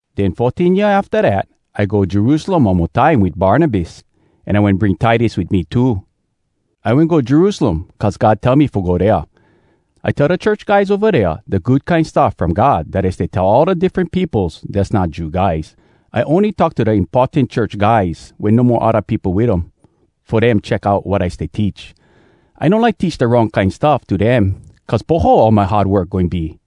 Den fourteen year afta dat, I go Jerusalem one mo time wit Barnabas. An I wen bring Titus wit me too. I wen go Jerusalem cuz God tell me fo go dea. I tell da church guys ova dea da Good Kine Stuff From God dat I stay tell all da diffren peopos dass not Jew guys. I ony talk to da importan church guys wen no mo odda peopo wit um, fo dem check out wat I stay teach. I no like teach da wrong kine stuff to dem, cuz poho all my hard work goin be.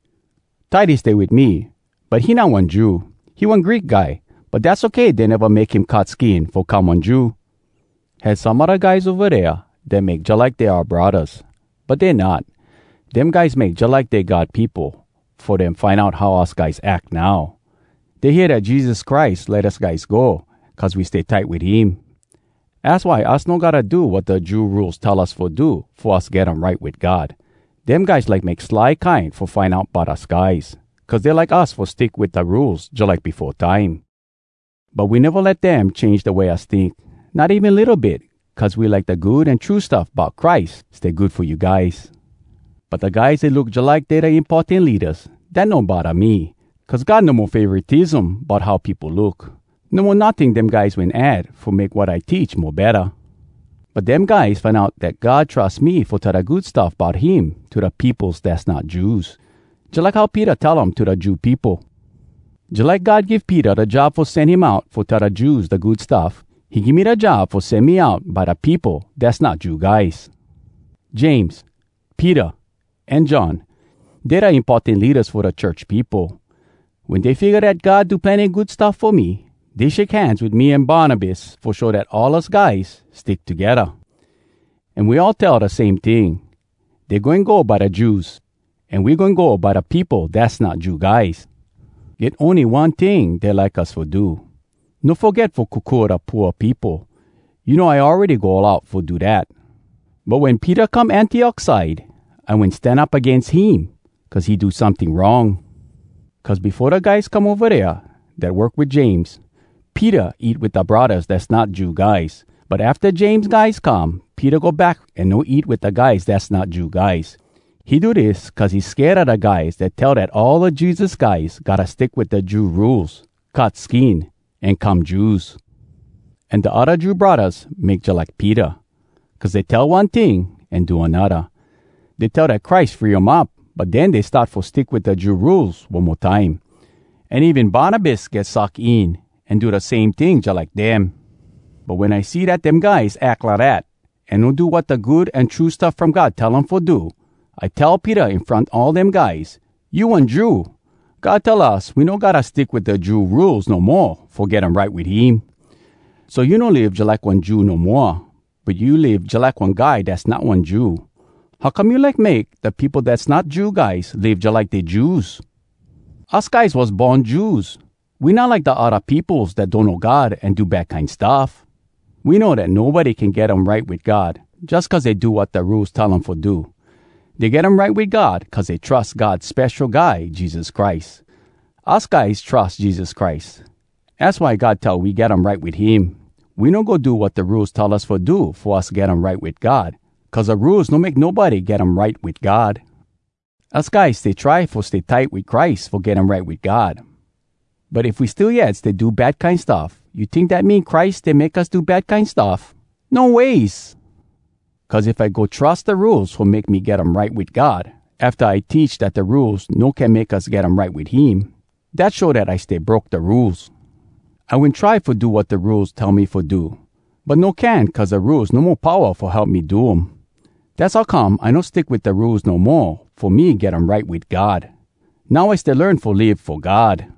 Titus stay wit me, but he not one Jew. He one Greek guy. But dass okay dey neva make him cut skin fo come one Jew. Had some odda guys ova dea dat make jalike dey oua braddahs, but dey not. Dem guys make jalike dey God peopo fo dem find out how us guys ack now. Dey hear dat Jesus Christ let us guys go cuz we stay tight wit him. Az why us no gotta do wat da Jew Rules tell us fo do fo us get um right wit God. Dem guys like make sly kine fo find out bout us guys, cuz dey like us fo stick wit da Rules jalike befo time. But we neva let dem change da way us tink, not even litto bit cuz we like da Good An True Stuff Bout Christ stay good fo you guys. But da guys dat look jalike dey da importan leadas, dat no bodda me, cuz God no mo favoratism bout how peopo look. No mo notting dem guys wen add fo make wat I teach mo betta. But dem guys find out dat God trus me fo tell da Good Stuff Bout Him to da peopos dass not Jews, jalike how Peter tell um to da Jew peopo. Jalike God give Peter da job fo sen him out fo tell da Jews da Good Stuff, he give me da job fo sen me out by da peopo dass not Jew guys. James, Peter, an John, dey da importan leadas fo da church peopo. Wen dey figga dat God do plenny good stuff fo me, dey shake hands wit me an Barnabas fo show dat all us guys stick togedda. An we all tell da same ting: dey goin go by da Jews, an we goin go by da peopo dass not Jew guys. Get ony one ting dey like us fo do: no foget fo kokua da pooa peopo. You know I awready go all out fo do dat. But wen Peter come Antiok side, I wen stan up agains him cuz he do someting wrong. Cuz befo da guys come ova dea dat work wit James, Peter eat wit da braddahs dass not Jew guys. But afta James guys come, Peter go back an no eat wit da guys dass not Jew guys. He do dis cuz he sked a da guys dat tell dat all Jesus guys gotta stick wit da Jew Rules, cut skin, an come Jews. An da odda Jew braddahs make jalike Peter, cuz dey tell one ting an do anodda. Dey tell dat Christ free um up, but den dey start fo stick wit da Jew Rules one mo time. An even Barnabas get suck in, an do da same ting jalike dem. But wen I see dat dem guys ack lidat, an no do wat da Good An True Stuff From God tell um fo do, I tell Peter in front all dem guys, “You one Jew. God tell us we no gotta stick wit da Jew Rules no mo fo get um right wit him. So you no live jalike one Jew no moa, but you live jalike one guy dass not one Jew. How come you like make da peopo dass not Jew guys live jalike dey Jews?” Us guys was born Jews. We not like da odda peopos dat donno God an do bad kine stuff. We know dat nobody can get um right wit God jus cuz dey do wat da Rules tell um fo do. Dey get um right wit God cuz dey trus God Spesho Guy Jesus Christ. Us guys trus Jesus Christ. Az why God tell we get um right wit him. We no go do wat da Rules tell us fo do fo us get um right wit God cuz da Rules no make nobody get um right wit God. Us guys stay try fo stay tight wit Christ fo get um right wit God. But if we still yet stay do bad kine stuff, you tink dat mean Christ stay make us do bad kine stuff? No ways! Cuz if I go trus da Rules fo make me get um right wit God, afta I teach dat da Rules no can make us get um right wit him, dat show dat I stay broke da Rules. I wen try fo do wat da Rules tell me fo do, but no can cuz da Rules no mo powa fo help me do um. Dass how come I no stick wit da Rules no mo fo me get um right wit God. Now I stay learn fo live fo God.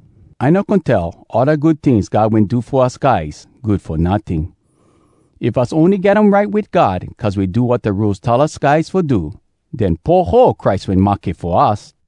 I no goin tell all da good tings God wen do fo us guys good fo notting. If us ony get um right wit God cuz we do wat da Rules tell us guys fo do, den poho Christ wen mahke fo us.